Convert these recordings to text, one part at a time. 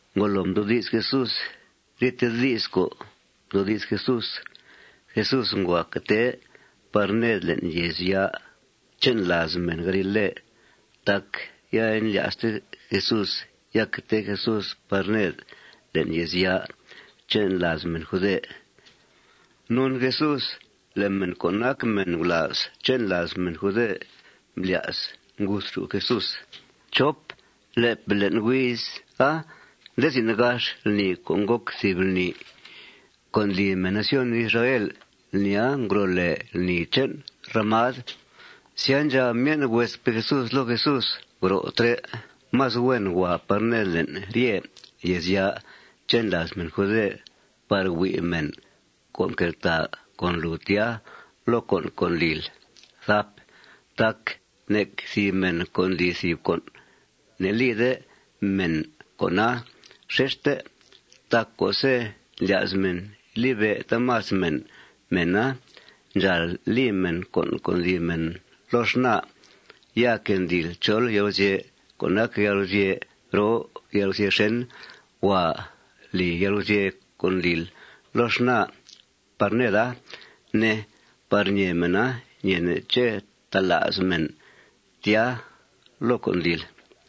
Ngolo mdoodi's Jesús ryete di's co' mdoodi's Jesús, Jesús ngua que tee par ned le'n yèezya' che'n làaz mèn galile tac ya indlya'ste Jesús ya que tee Jesús par ned le'n yèezya' che'n làaz mèn jude. Non Jesús le' mèn co' nac mèn gulàaz che'n làaz mèn jude mblya's nguthxù' Jesús. Le'pe' le'n huiza nde zin gax lni co' ngòc thìb lni co' ndli mèn nación Israel. Lnia ngro' lèe lni che'n ramad. Sya, ndxab myen' huespe' Jesús loo Jesús: ―Gro' trè'. Más huen huàa par ned le'n rye yèezya' che'n làaz mèn jude par hui' mèn co' nqueltàa con lùu tya loo con' co' ndlil. Tac nec thìb mèn co' ndli thìb con', ne'lide mèn con'a xexte. Tac co'se' ndlya's mèn libe' taamas mèn mèna, ndxàal li mèn con' co' ndli mèna loo xnaa. Ya que ndlil chol yalguzye' co' nac yalguzye' roo yalguzye' xèn, huàa li yalguzye' co' ndlil loo xnaa par neda, ne, par ñèe mèna ñeene' ché' tala's mèn tya loo con' ndlil.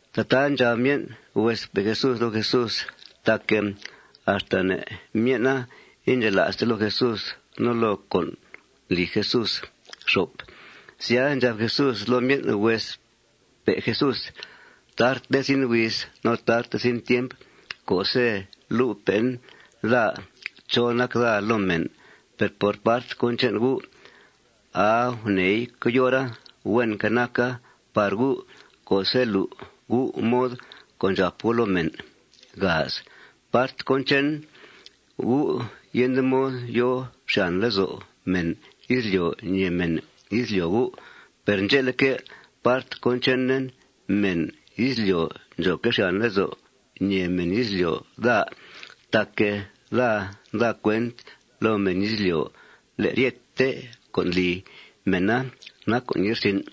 Tataa ndxab myen' huespe' Jesús loo Jesús tac axta ne' myen'a indxela'ste loo Jesús no loo con' ndli Jesús. Sya, ndxab Jesús loo myen' huespe' Jesús: ―Tarte zin huiz no tarte zin tiemp co'se' lu'pe'en daa chó nac daa loo mèn. Per part cón che'n gu', aa guneei coyora huenque' naca par gu' co'se' lu' gu' mod co' ndxàp gu' loo mèn. Part cón che'n gu', yende mod yòo xyàn lezo' mèn izlyo' ñèe mèn izlyo' gu'. Per ndxe'leque', part cón chenen, mèn izlyo' ndxòoque' xyàn lezo' ñèe mèn izlyo' daa tac daa nda cuent loo mèn izlyo' le' ryete con' ndli mèna nac con' ye'rsin'.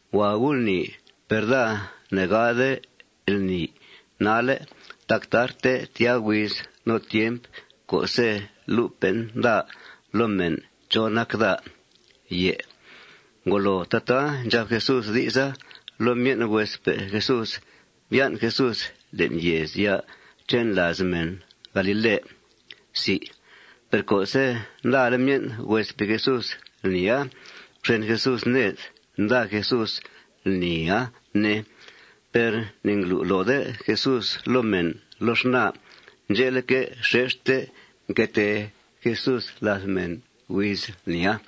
Huàa gu' lni. Per daa ne'gade lni nalle' tac tarte tyaa huiz no tiemp co'se' lu'pe'en daa loo mèn chó nac daa. Ngolo tataa ndxab Jesús di'sa loo myen' huespe' Jesús, mbyan' Jesús le'n yèezya' che'n làaz mèn galile. Per co'se' ndale' myen' huespe' Jesús lnia, mxen Jesús ned. Nda Jesús lnia, ne. Per ne'nglu' loode Jesús loo mèn loo xnaa. Ndxe'leque', xexte mque tee Jesús làth mèn huiz lnia.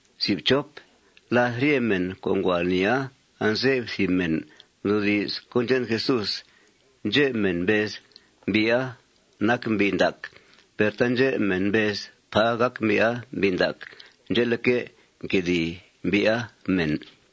No làth rye mèn co' ngua lnia, anze'f thìb mèn mdoodi's cón che'n Jesús. Ndxep mèn mbez: ―Mbi'a nac mbi' ndac. Per taandxep mèn mbez: ―Pà gàc mbi'a mbi' ndac. Ndxe'leque', nquedìi mbi'a mèn.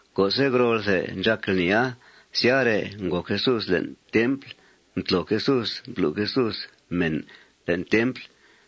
Co'se' ngrolthe ndxàc lnia, syare' ngòo Jesús le'n templ. Mtlo Jesús, mblu' Jesús mèn le'n templ.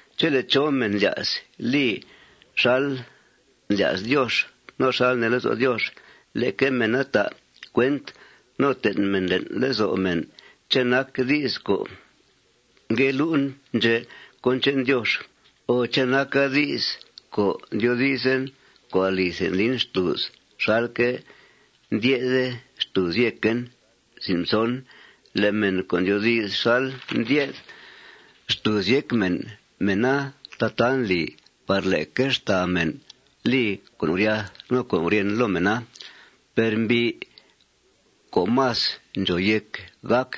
Chele' chó mèn ndlya's li xal ndlya's Diox no xal nee lezo' Diox, leque mèn ta' cuent no ten' mèn le'n lezo' mèn ché' nac di's co' ngue lu'en ndxè' cón che'n Diox o ché' naca di's co' ndyoodizen co' alithe ndlin xtùuz xalque' ndye'th xtùuz yéquen. Le' mèn co' ndyoodi's xal ndye'th xtùuz yéc mèn, mèna tataa ndli par leque xtàa mèn li con' guryath no con' guryèn loo mèna. Per mbi' co' más ndxòo yéc gàc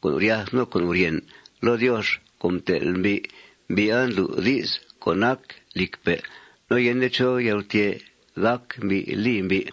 con' guryath no con' guryèn loo Diox co' mtel' mbi', mbi'a ndlu' di's co' nac lìcpe' no yende chó yalgutyè' gác mbi' li mbi'.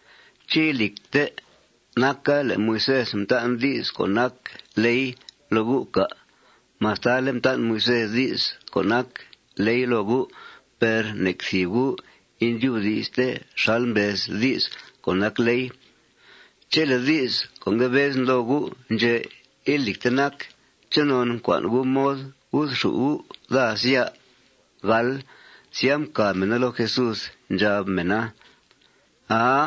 ¿Ché' ilìcte naca le' Moisés mtan' di's co' nac ley loo gu', cà'? Mastale' mtan' Moisés di's co' nac ley loo gu', per nec thìb gu' indyubdi'ste xal mbez di's co' nac ley. Chele' di's co' ngue bezen loo gu' ndxè' ilìcte nac, ¿chonon ncua'n gu' mod guthxù' gu' daa, sya? Sya, mcàb mèna loo Jesús. Ndxab mèna: ―Aa.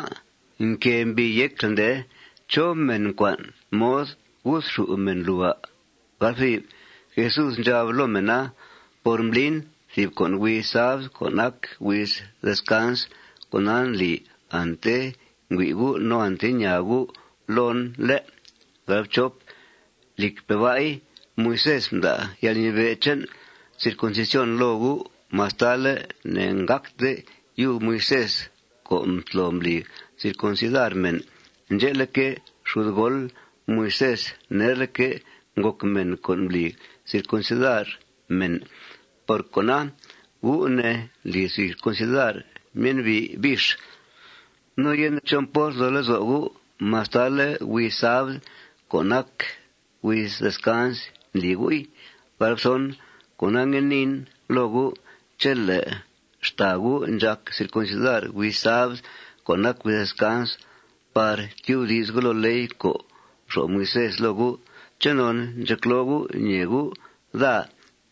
Nquée mbii yécl, ndee. ¿Chó mèn ncua'n mod guthxù' mèn lùu, à'? Jesús ndxab loo mèna: ―Por mblin thìb con' huiz sabd co' nac huiz descans, con'a ndli ante ngüi' gu' no ante ñaa gu' loon, ¿lé'? Lìcpe' ba'i, Moisés mda' yalnibe' che'n circuncisión loo gu' mastale' ne'ngàcte yub Moisés co' mtlo mbli circuncidar mèn. Ndxe'leque', xudgool Moisés nerleque' ngòc mèn co' mbli circuncidar mèn. Por cona, gu', ne, ndli circuncidar myen'bi' bix. No yende chó mport nzo lezo' gu' mastale' huiz sabd co' nac huiz descans ndli gu'i. Cona, ngue niin loo gu': Chele' xtàa gu' ndxàc circuncidar huiz sabd co' nac huiz descans par tyubdi's gu' loo ley co' mxo'f Moisés loo gu', ¿chonon ndxecloo gu' ñèe gu' daa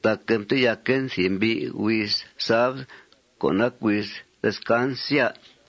tac mteyaquen thìb mbi' huiz sabd co' nac huiz descans, sya?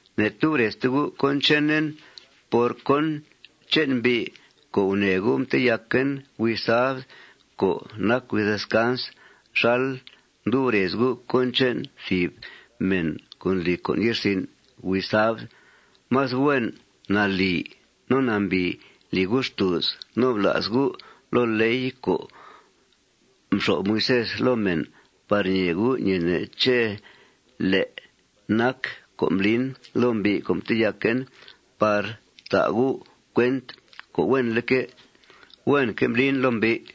Ne'tub rezte gu' cón chenen por cón che'n mbi' co' gunèe gu' mteyaquen huiz sabd co' nac huiz descans xal ndub rez gu' cón che'n thìb mèn co' ndli con' ye'rsin' huiz sabd. Más huen, nalì no nambìi li gu' xtùuz no bla's gu' loo ley co' mxo'f Moisés loo mèn par ñee gu' ñeene' ché' lé' nac co' mblin loo mbi' co' mteyaquen par ta' gu' cuent co' huenleque', huenque' mblin loo mbi'.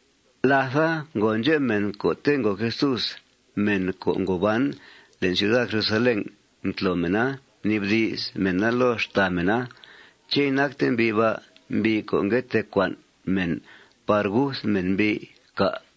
Látha ngo ndxep mèn co'te' ngo Jesús, mèn co' ngo ban le'n ciuda Jerusalén. Mtlo mèna, mnibdi's mèna loo xtàa mèn: ―¿Ché' inacte mbi' ba' mbi' co' ngue tee cua'n mèn par guth mèn mbi', cà'?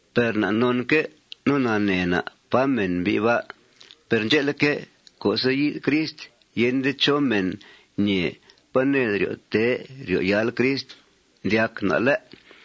Per na' nonque' no nanee na' pá mèn mbi' ba'. Per ndxe'leque', co'se' yi'th Crist, yende chó mèn ñee pá ned ryo' tee ryo' yáal Crist, ndyac na', ¿lé'?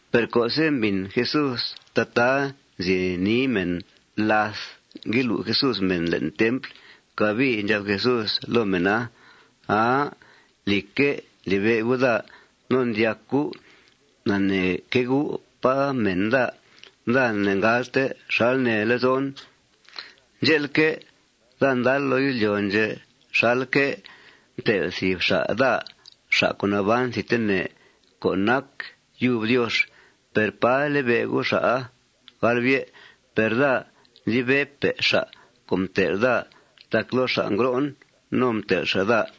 Per co'se' mbìn Jesús tataa nzi nii mèna làth ngue lu' Jesús mèn le'n templ, cabii ndxab Jesús loo mèna: ―Aa. Lìcque', ndlibe' gu' daa. No ndyac gu' naneeque' gu' pá mèn daa. Daa ne'ngalte xal nee lezon. Ndxe'leque', daa ndal loo izlyo' ndxè' xalque' mtel' thìb xa' daa, xa' co' naban thidtene co' nac yub Diox. Per ¡pà libe' gu' xa'a! Per daa ndlibe'pe' xa' co' mtel' daa tac loo xa' ngro'en. No mtel' xa' daa.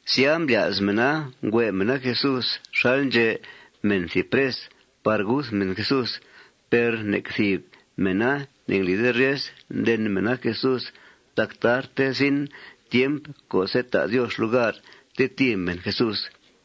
Sya, mblya's mèna nghue' mèna Jesús xal ndxe' mèn thìb pres par guth mèn Jesús. Per nec thìb mèna ne'nglide ryes nden mèna Jesús tac tarte zin tiemp co'se' ta' Diox lugar tetìi mèn Jesús.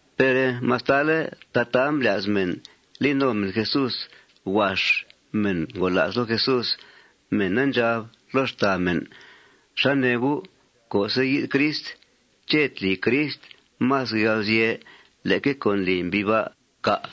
Per mastale' tataa mblya's mèn li no mèn Jesús, huax mèn ngola's loo Jesús. Mèna ndxab loo xtàa mèn: ―¿Xá nee gu'? Co'se' yi'th Crist, ¿ché' tli Crist más yalguzye' leque co' ndli mbi' ba', cà'?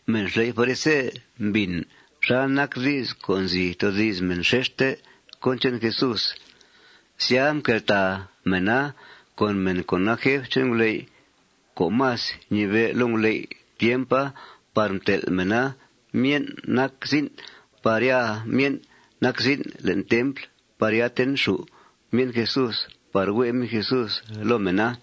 Mèn xley' farise mbìn xal nac di's co' nzi toodi's mèn xexte cón che'n Jesús. Sya, mqueltàa mèna con mèn co' nac jef che'n nguley' co' más ñibe' loo nguley' tiempa par mtel' mèna myen' nac zin' par ya myen' nac zin' le'n templ par ya tenxù' myen' Jesús par hue' myen' Jesús loo mèna.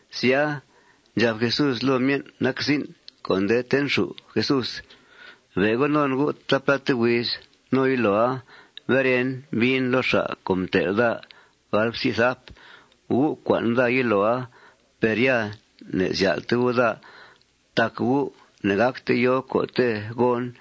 Sya, ndxab Jesús loo myen' nac zin' co' nde tenxù' Jesús: ―Be' go non gu' taapláte huiz. No yiloa beren, biin loo xa' co' mtel' daa. Gu' cua'n daa yiloa. Per ya ne'zyál'te gu' daa tac gu' ne'gácte yòo co'te' gòon.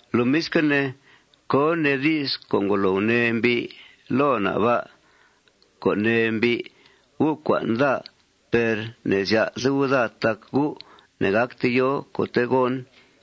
Lomisque' ne, ¿cón nee di's co' ngolo gunee mbi' loo na' ba' co' nee mbi': Gu' cua'n daa. Per ne'zyál'te gu' daa tac gu' ne'gácte yòo co'te' gòon?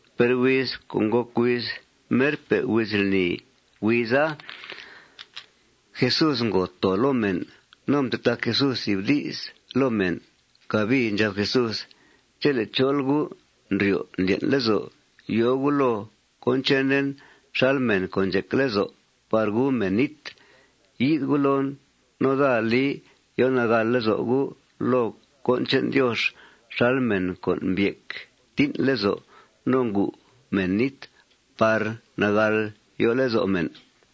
Per huiz co' ngòc huiz merpe' huiz lni, huiza Jesús ngo too loo mèn. No mtetac Jesús thìb di's loo mèn. Cabii ndxab Jesús: ―Chele' chol gu' ndryo' ndlyen' lezo' yòo gu' loo cón chenen xal mèn co' ndxec lezo' par gu mèn nít, yi'th gu' loon no daa li yo nagàl lezo' gu' loo cón che'n Diox xal mèn co' mbyec tín' lezo' no ngu mèn nít par nagàl yo lezo' mèn.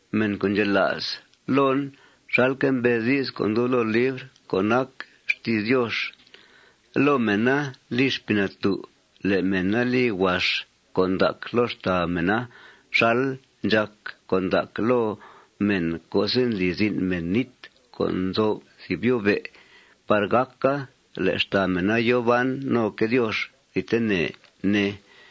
Mèn co' ndxela's loon xalque' mbez di's co' ndub loo libr co' nac xti's Diox, loo mèna li Xpii Natú' le' mèna li huax con' ndac loo xtàa mèna xal ndxàc con' ndac loo mèn co'se' ndli zin' mèn nít co' nzo'f thìb yó'be' par gàca le' xtàa mèna yòo ban noque' Diox thidtene, ne.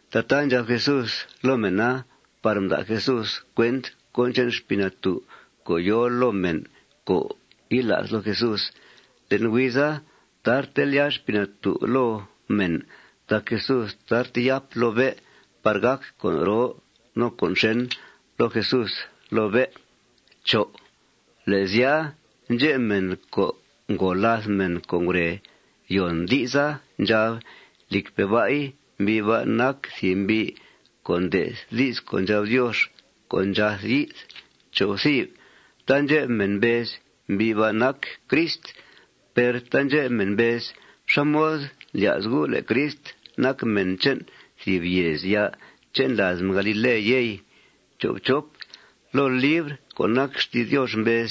Tataa ndxab Jesús loo mèna par mda' Jesús cuent cón che'n Xpii Natú' co' yòo loo mèn co' yila's loo Jesús. Le'n huiza tarte lyàa Xpii Natú' loo mèn tac Jesús tarte yáp loo bé' par gàc con' roo no con' xèn loo Jesús loo bé'. Le' sya, ndxep mèn co' ngo làth mèn co' ngure yòn di'sa ndxab: ―Lìcpe' ba'i, mbi' ba' nac thìb mbi' co' nde'th di's co' ndxab Diox co' ndxath yi'th. Taandxep mèn mbez: ―Mbi' ba' nac Crist. Per taandxep mèn mbez: ―¿Xá mod ndlya's gu' le' Crist nac mèn che'n thìb yèezya' che'n làaz mèn galile, yey? Loo libr co' nac xti's Diox mbez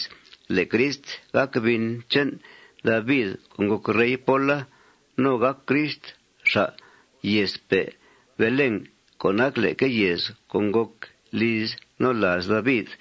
le' Crist gàc bin che'n David co' ngòc rey póla. No gàc Crist xa' yèezpe' Belén co' nac leque yèez co' ngòc liz no làaz David.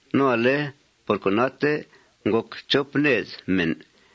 No ale por conate ngòc chop ned mèn.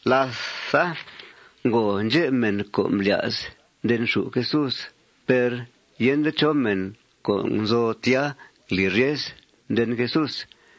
Làtha, ngo ndxep mèn co' mblya's ndenxù' Jesús. Per yende chó mèn co' nzo tya ngli ryes nden Jesús.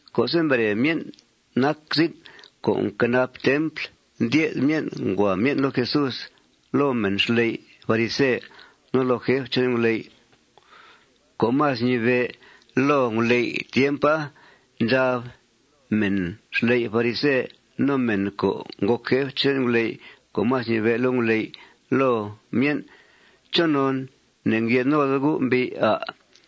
Co'se' mbere myen' nac zin' co' nquenap templ, ndye'th myen' ngua myen' loo Jesús, loo mèn xley' farise, no loo jef che'n nguley' co' más ñibe' loo nguley' tiempa, ndxab mèn xley' farise no mèn co' ngòc jef che'n nguley' co' más ñibe' loo nguley' loo myen': ―¿Chonon ne'ngye'th node gu' mbi'a, à'?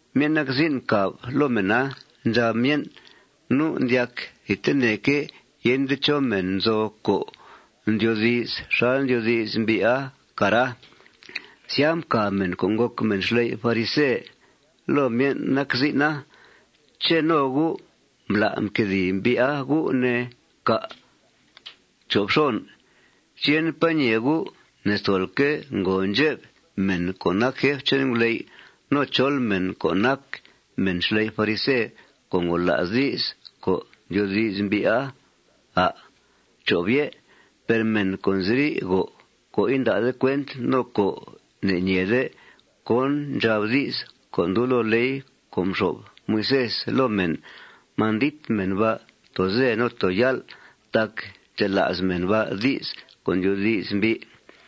Myen' nac zin' mcàb loo mèna. Ndxab myen': ―Nu' ndyac thidteneque' yende chó mèn nzo co' ndyoodi's xal ndyoodi's mbi'a, cara. Sya, mcàb mèn co' ngòc mèn xley' farise loo myen' nac zin'a: ―¿Ché' no gu' mbla' mquedìi mbi'a gu', ne, cà'? ¿Ché' yende pá ñee gu' ne'stolque' ngo ndxep mèn co' nac jef che'n nguley' no chol mèn co' nac mèn xley' farise co' ngola's di's co' ndyoodi's mbi'a, à'? Per mèn co' nziri' go co' inda'de cuent no co' ne'ñeede co' ndxab di's co' ndub loo ley co' mxo'f Moisés loo mèn, mandit mèn ba' too ze no too yál' tac ndxela's mèn ba' di's co' ndyoodi's mbi'.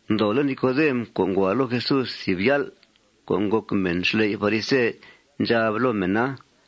Ndoole' Nicodem co' ngua loo Jesús thìb yál', co' ngòc mèn xley' farise, ndxab loo mèna: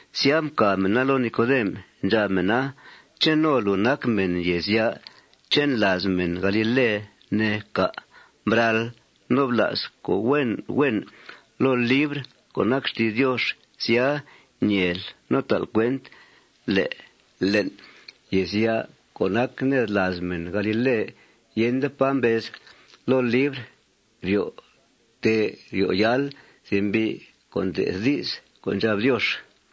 Sya, mcàb mèna loo Nicodem. Ndxab mèna: ―¿Ché' no luu nac mèn yèezya' che'n làaz mèn galile, ne, cà'? Bral no bla's co' huen huen loo libr co' nac xti's Diox. Sya, ñeel no ta'l cuent le' le'n yèezya' co' nac ned làaz mèn galile, yende pá mbez loo libr ryo' tee ryo' yáal thìb mbi' co' nde'th di's co' ndxab Diox.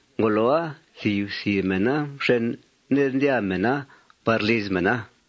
Ngoloa, thìb thìb mèna mxen ned, ndyàa mèna par liz mèn.